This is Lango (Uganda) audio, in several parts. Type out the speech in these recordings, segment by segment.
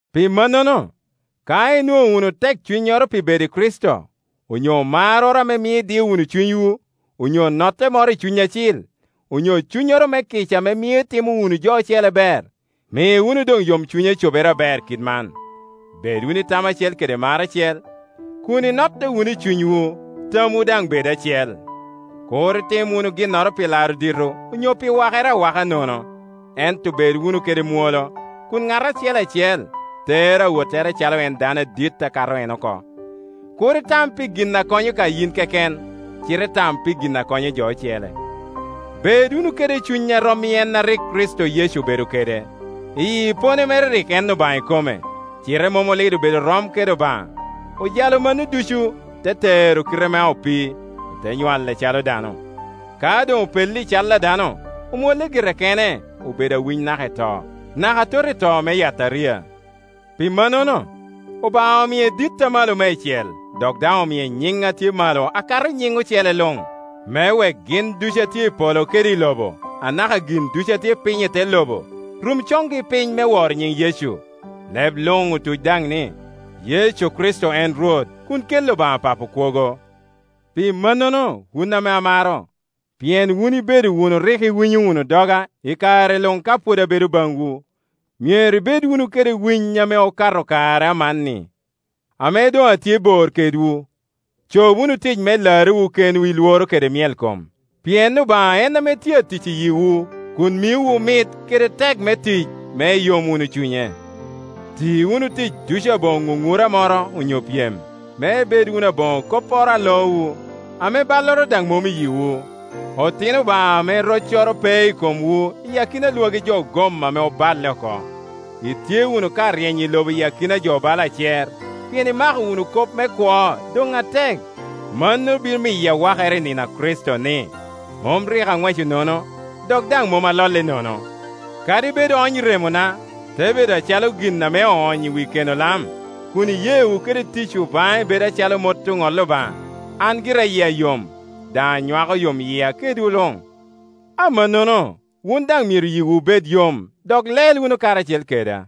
Pi mannono, ka inwoŋo wunu tekcunnyoro pi bedo i Kricito, onyo marroro ame mio idio wunu cunywu, onyo notte moro i Cuny Acil, onyo cunnyoro me kica ame mio itimo wunu jo ocele ber, mi wunu doŋ yomcunya cobere aber kit man: bed wunu i tam acel kede mar acel, kun inotte wunu i cunywu, tamwu daŋ bed acel. Kur itim wun ginnoro pi laro dito onyo pi wakere awaka nono, ento bed wunu kede mwolo, kun ŋat acel acel tero awottere acalo en dano adit akato en oko. Kur itam pi gin ame konyo ka yin keken, cite tam pi gin a konyo jo ocele. Bed wunu kede cuny a rom i en a rik Kricito Yecu obedo kede. Iyi epone mere rik en Obaŋa ikome, cite mom olido bedo rom kede Obaŋa. Ojalo mano ducu, te tero kite ma opii, ote nywale acalo dano. Ka doŋ opello i cal dano, omwolle gire kene, obedo awiny naka i to, naka atot i to me yataria. Pi mannono, Obaŋa omie dit amalo meicel, dok daŋ omie nyiŋ a tye malo akato nyiŋ ocele luŋ, me wek gin ducu a tye i polo kede i lobo, anaka gin ducu a tye piny i te lobo, rum coŋgi piny me woro nyiŋ Yecu, leb luŋ otuc daŋ ni, Yecu Kricito en Rwot, kun kelli Obaŋa Papo kwogo. Pi mannono, wun ame amaro, pien wun ibedo wunu rik iwinyo wunu doga i kare luŋ ka pwod abedo baŋwu, myero ibed wunu kede winy ame okato kare amanni ame doŋ atye bor kedwu. Cob wunu tic me larrewu kenwu i lworo kede myelkom, pien Obaŋa en ame tye atic i yiwu kun miowu mit kede teko me tic, me iyom wunu cunye. Ti wunu tic ducu aboŋo ŋuŋura moro onyo pyem, me ibed wunu aboŋo kopporo a loowu, ame balloro daŋ mom i yiwu, otino Obaŋa ame roccoro pe i komwu i akina Iwagi jo ogom ame oballe oko. Itye wunu ka ryeny i lobo iyi akina jo bala acer, pien imako wunu kop me kwo doŋ atek. Mano bino miyo awakere i nino a Kricito ni, mom rik aŋweco nono, dok daŋ mom alolle nono. Kadi bed oony remona, te bedo acalo gin ame oonyo i wi keno lam, kun iyeewu kede ticwu baŋe bedo acalo mot ame oŋolli Obaŋa, an gira yia yom, daŋ anywako yomyia kedwu luŋ. Amannono, wun daŋ myero yiwu bed yom, dok lel wunu karacel keda.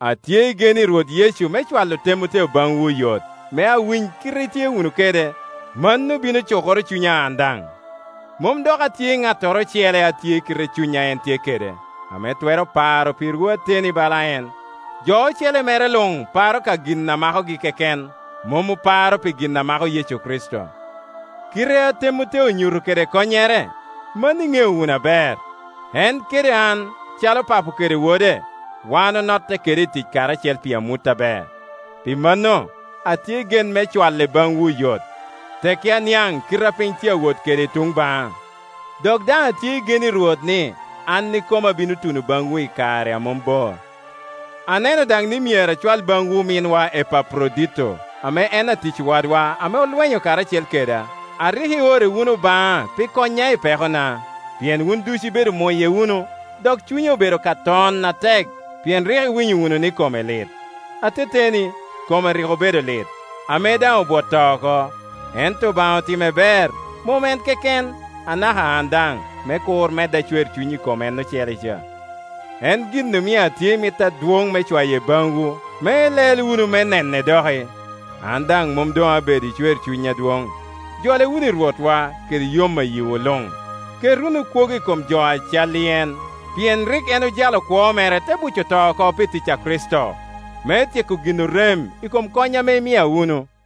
Atye i gen i Rwot Yecu me cwalo Temoteo baŋwu oyot, me awiny kite itye wunu kede; mano bino cukoro cunya an daŋ. Mom dok atye i ŋattoro ocele a tye i kite cuny a en tye kede, ame twero paro pirwu ateteni bala en. Jo ocele mere luŋ paro ka gin a makogi keken, mom oparo pi gin a mako Yecu Kricito. Kite a Temoteo onyuto kede konnyere, mano iŋeo wunu aber. En kede an calo papo kede wode; wan onotte kede i tic karacel pi amut aber. Pi manno, atye i gen me cwale baŋwu oyot, tekki aniaŋ kite a piny tye awot kede i tuŋ baŋa. Dok daŋ atye i gen i Rwot ni an ikoma abino tuno baŋwu i kare a mom bor. Aneno daŋ ni myero acwal baŋwu ominna Epaprodito, ame en atic wadwa ame olwenyo karacel keda, a rik iore wunu baŋa pi konya i pekona. Pien wun ducu ibedo muye wunu, dok cunye obedo ka ton atek, pien rik iwinyo wunu ni kome lit. Ateteni, kome rik obedo alit, ame daŋ obwot to oko. Ento Obaŋa otimme ber; mom en keken, anaka an daŋ, me kur medda cwercuny i kom en ocele ca. En gin omio atye i mit adwoŋ me cwaye baŋwu me ilel wunu me nene doki, an daŋ mom doŋ abed i cwercuny adwoŋ, jole wunu i Rwotwa kede yom a yiwu luŋ; ket wunu kwogo i kom jo a cal i en. Pien rik en ojalo kwo mere te buco to oko pi tic a Kricito, me tyeko gin orem i kom kony ame imia wunu.